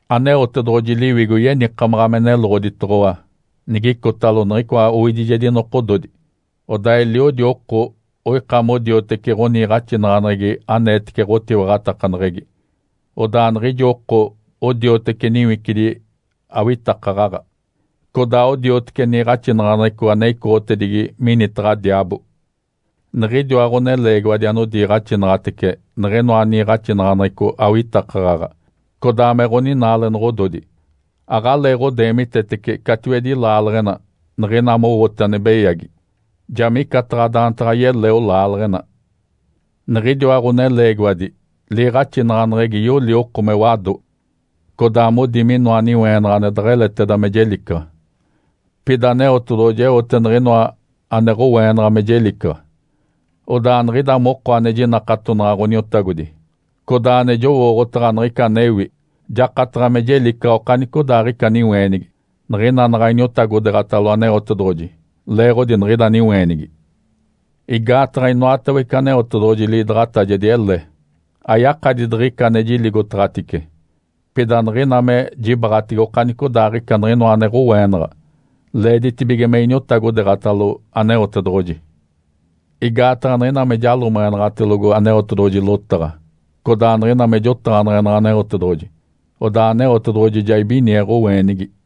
Aneotedoɡ̶oji Liwigo yenikamaɡ̶a me neloɡ̶oditoɡ̶owa nigicotalo niɡ̶icoa owidijedi nokododi, odaa eliodi oko oika modioteci ɡ̶oniiɡ̶axinaɡ̶aneɡ̶egi aneetece ɡ̶otiwaɡ̶atakaneɡ̶egi. Odaa niɡ̶idi oko odioteci niwicidi awitakaɡ̶aɡ̶a, codaa odioteci niiɡ̶axinaɡ̶aneɡ̶eco ane icoɡ̶otedigi minitaɡ̶a diaabo. Niɡ̶idiwa ɡ̶oneleegiwadi anodiiɡ̶axinaɡ̶atece niɡ̶inoa niiɡ̶axinaɡ̶aneɡ̶eco awitakaɡ̶aɡ̶a codaa me ɡ̶oninaalenoɡ̶ododi. Aɡ̶aleeɡ̶odeemitetece catiwedi laaleɡ̶ena niɡ̶ina mowote ane beyagi, ja micataɡ̶a daantaɡ̶a yeleo laaleɡ̶ena. Niɡ̶idiwa ɡ̶oneleegiwadi liiɡ̶axinaɡ̶aneɡ̶egi yoli oko me wado, codaa modi minoa niweenaɡ̶a ane deɡ̶eleteda me jelicaɡ̶a. Pida Aneotedoɡ̶oji eote niɡ̶inoa ane ɡ̶oweenaɡ̶a me jelicaɡ̶a, odaa niɡ̶ida moko ane jinakatonaɡ̶a Ǥoniotagodi, codaa ane jowooɡ̶otaɡ̶a niɡ̶ica anewi, jakataɡ̶a me jelicaɡ̶a okanicodaaɡ̶ica niweenigi, niɡ̶ina naɡ̶a iniotagodeeɡ̶atalo Aneotedoɡ̶oji leeɡ̶odi niɡ̶ida niweenigi. Igaataɡ̶a inoatawece Aneotedoɡ̶oji liidaɡ̶atajedi ele, ayakadi diɡ̶ica ane jiligotaɡ̶atice, pida niɡ̶ina me jibaɡ̶atege okanicodaaɡ̶ica niɡ̶inoa ane ɡ̶oweenaɡ̶a, leeditibige me iniotagodeeɡ̶atalo Aneotedoɡ̶oji. Igaataɡ̶a niɡ̶ina me jalomeɡ̶enaɡ̶atelogo Aneotedoɡ̶oji lotaɡ̶a, codaa niɡ̶ina me jotaɡ̶aneɡ̶enaɡ̶a Aneotedoɡ̶oji, odaa Aneotedoɡ̶oji ja ibinie ɡ̶oweenigi.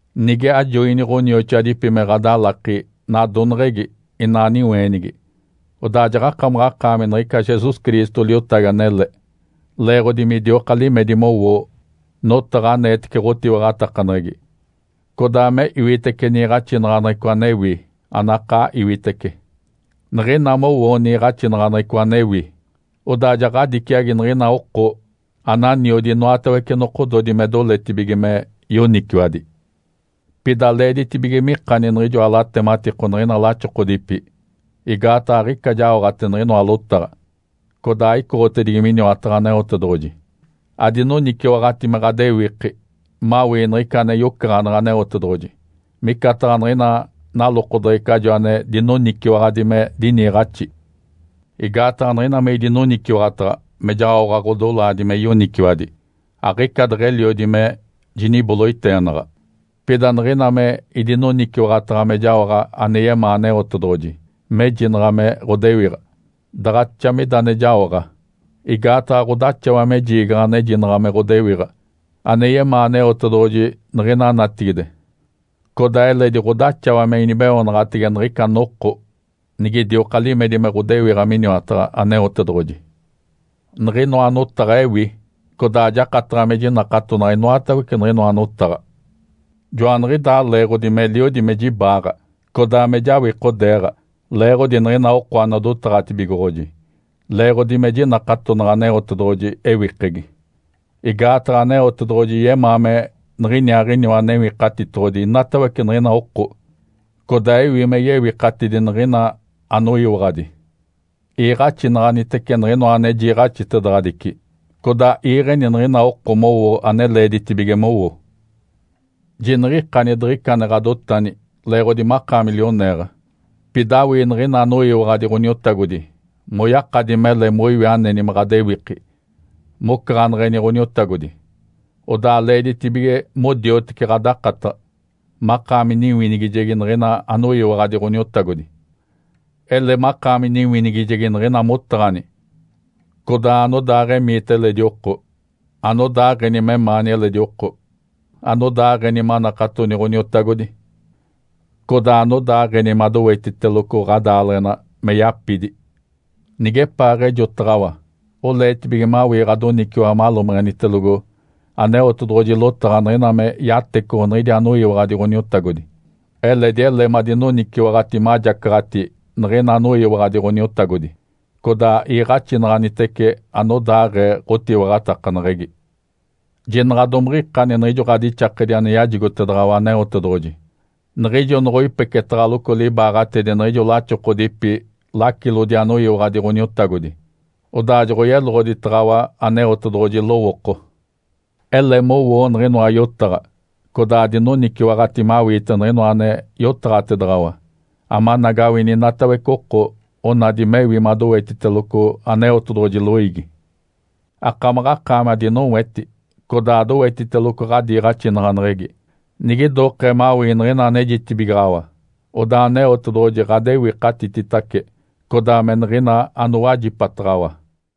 Nige ajoini ɡ̶onioxoadipi me ɡ̶adalaki nadoneɡ̶egi inaa niweenigi, odaa jaɡ̶akamaɡ̶akaami niɡ̶ica Jesus Cristo liotagi anele, leeɡ̶odi midioka limedi mowoo notaɡ̶a aneetece ɡ̶otiwaɡ̶atakaneɡ̶egi, codaa me iwitece niiɡ̶axinaɡ̶aneɡ̶eco anewi, anakaa iwitece. Niɡ̶ina mowoo niiɡ̶axinaɡ̶aneɡ̶eco anewi, odaa ja ɡ̶adiciagi niɡ̶ina oko ananiodi inoatawece nokododi me doletibige me yoniciwadi. Pida leeditibige mikani niɡ̶ijoa latematiko niɡ̶ina laxokodipi, igaataɡ̶a aɡ̶ica jaoɡ̶ate niɡ̶inoa lotaɡ̶a, codaa aicoɡ̶otedigi miniwataɡ̶a Aneotedoɡ̶oji. Adinoniciwaɡ̶ati me ɡ̶adewiki mawii niɡ̶ica ane yocaɡ̶aneɡ̶e Aneotedoɡ̶oji micataɡ̶a niɡ̶ina nalokodeɡ̶ecajo ane dinoniciwaɡ̶adi me diniiɡ̶axi. Igaataɡ̶a niɡ̶ina me idinoniciwaɡ̶ataɡ̶a me jaoɡ̶a ɡ̶odolaadi me yoniciwadi aɡ̶ica deɡ̶eliodi me jiniboloiteenaɡ̶a, pida niɡ̶ina me idinoniciwaɡ̶ataɡ̶a me jaoɡ̶a ane yemaa Aneotedoɡ̶oji mejinaɡ̶a me ɡ̶odewiɡ̶a, daɡ̶axa mida ane jaoɡ̶a. Igaataɡ̶a ɡ̶odaxawa me jiigaɡ̶a anejinaɡ̶a me ɡ̶odewiɡ̶a ane yemaa Aneotedoɡ̶oji niɡ̶ina natigide, codaa eledi ɡ̶odaxawa me inibeoonaɡ̶atege niɡ̶ica noko nigidioka limedi me ɡ̶odewiɡ̶a miniwataɡ̶a Aneotedoɡ̶oji. Niɡ̶inoa notaɡ̶a ewi, codaa jakataɡ̶a me jinakatonaɡ̶a inoatawece niɡ̶inoa notaɡ̶a. Joaniɡ̶idaa leeɡ̶odi meliodi me jibaaɡ̶a, codaa me jawikodeeɡ̶a leeɡ̶odi niɡ̶ina oko anodotaɡ̶atibigoɡ̶oji, leeɡ̶odi me jinakatonaɡ̶a Aneotedoɡ̶oji ewikegi. Igaataɡ̶a Aneotedoɡ̶oji yemaa me niɡ̶iniaaɡ̶iniwa Newikatitoɡ̶odi inatawece niɡ̶ina oko, codaa ewi me yewikatidi niɡ̶ina anoyiwaɡ̶adi. Iiɡ̶axinaɡ̶anitece niɡ̶inoa ane jiiɡ̶axitedaɡ̶adici, codaa iiɡ̶eni niɡ̶ina oko mowo ane leeditibige mowo. Jiniɡ̶ikani diɡ̶ica ane ɡ̶adotani leeɡ̶odi makaami lioneeɡ̶a. Pida awii niɡ̶ina anoyiwaɡ̶adi Ǥoniotagodi moyakadi mele moiwi aneni me ɡ̶adewiki mocaɡ̶aneɡ̶eni Ǥoniotagodi, odaa leeditibige modioteci ɡ̶adakataɡ̶a, makaami niwinigijegi niɡ̶ina anoyiwaɡ̶adi Ǥoniotagodi. Ele makaami niwinigijegi niɡ̶ina motaɡ̶ani, codaa anodaaɡ̶emiita eledi oko, anodaaɡ̶eni memaani eledi oko, anodaaɡ̶eni manakatoni Ǥoniotagodi, codaa anodaaɡ̶eni madowetiteloco ɡ̶adaaleɡ̶ena me yapidi. Nigepaaɡ̶ejotaɡ̶awa oleetibige mawii ɡ̶adoniciwaɡ̶a malomeɡ̶enitelogo Aneotedoɡ̶oji lotaɡ̶a niɡ̶ina me yatecoɡ̶o niɡ̶idi anoyiwaɡ̶adi Ǥoniotagodi, eledi ele madinoniciwaɡ̶ati majacaɡ̶ati niɡ̶ina anoyiwaɡ̶adi Ǥoniotagodi, codaa iiɡ̶axinaɡ̶anitece anodaaɡ̶ee ɡ̶otiwaɡ̶atakaneɡ̶egi. Jinaɡ̶a domiɡ̶ikani niɡ̶ijo ɡ̶adixakedi ane yajigotedaɡ̶awa Aneotedoɡ̶oji niɡ̶ijo noɡ̶oipeketaɡ̶aloco libaaɡ̶atedi niɡ̶ijo laxokodipi lacilodi anoyiwaɡ̶adi Ǥoniotagodi, odaa joɡ̶oyeloɡ̶oditaɡ̶awa Aneotedoɡ̶oji lowooko. Ele mowoo niɡ̶inoa yotaɡ̶a, codaa adinoniciwaɡ̶ati mawiite niɡ̶inoa ane yotaɡ̶atedaɡ̶awa amanagawini inatawece oko onadi mewi madowetiteloco Aneotedoɡ̶oji loiigi. Akamaɡ̶akaami adinoweti codaa adowetiteloco ɡ̶adiiɡ̶axinaɡ̶aneɡ̶egi. Nigidokee mawii niɡ̶ina anejitibigaɡ̶awa, odaa Aneotedoɡ̶oji ɡ̶adewikatititace, codaa me niɡ̶ina anowajipataɡ̶awa.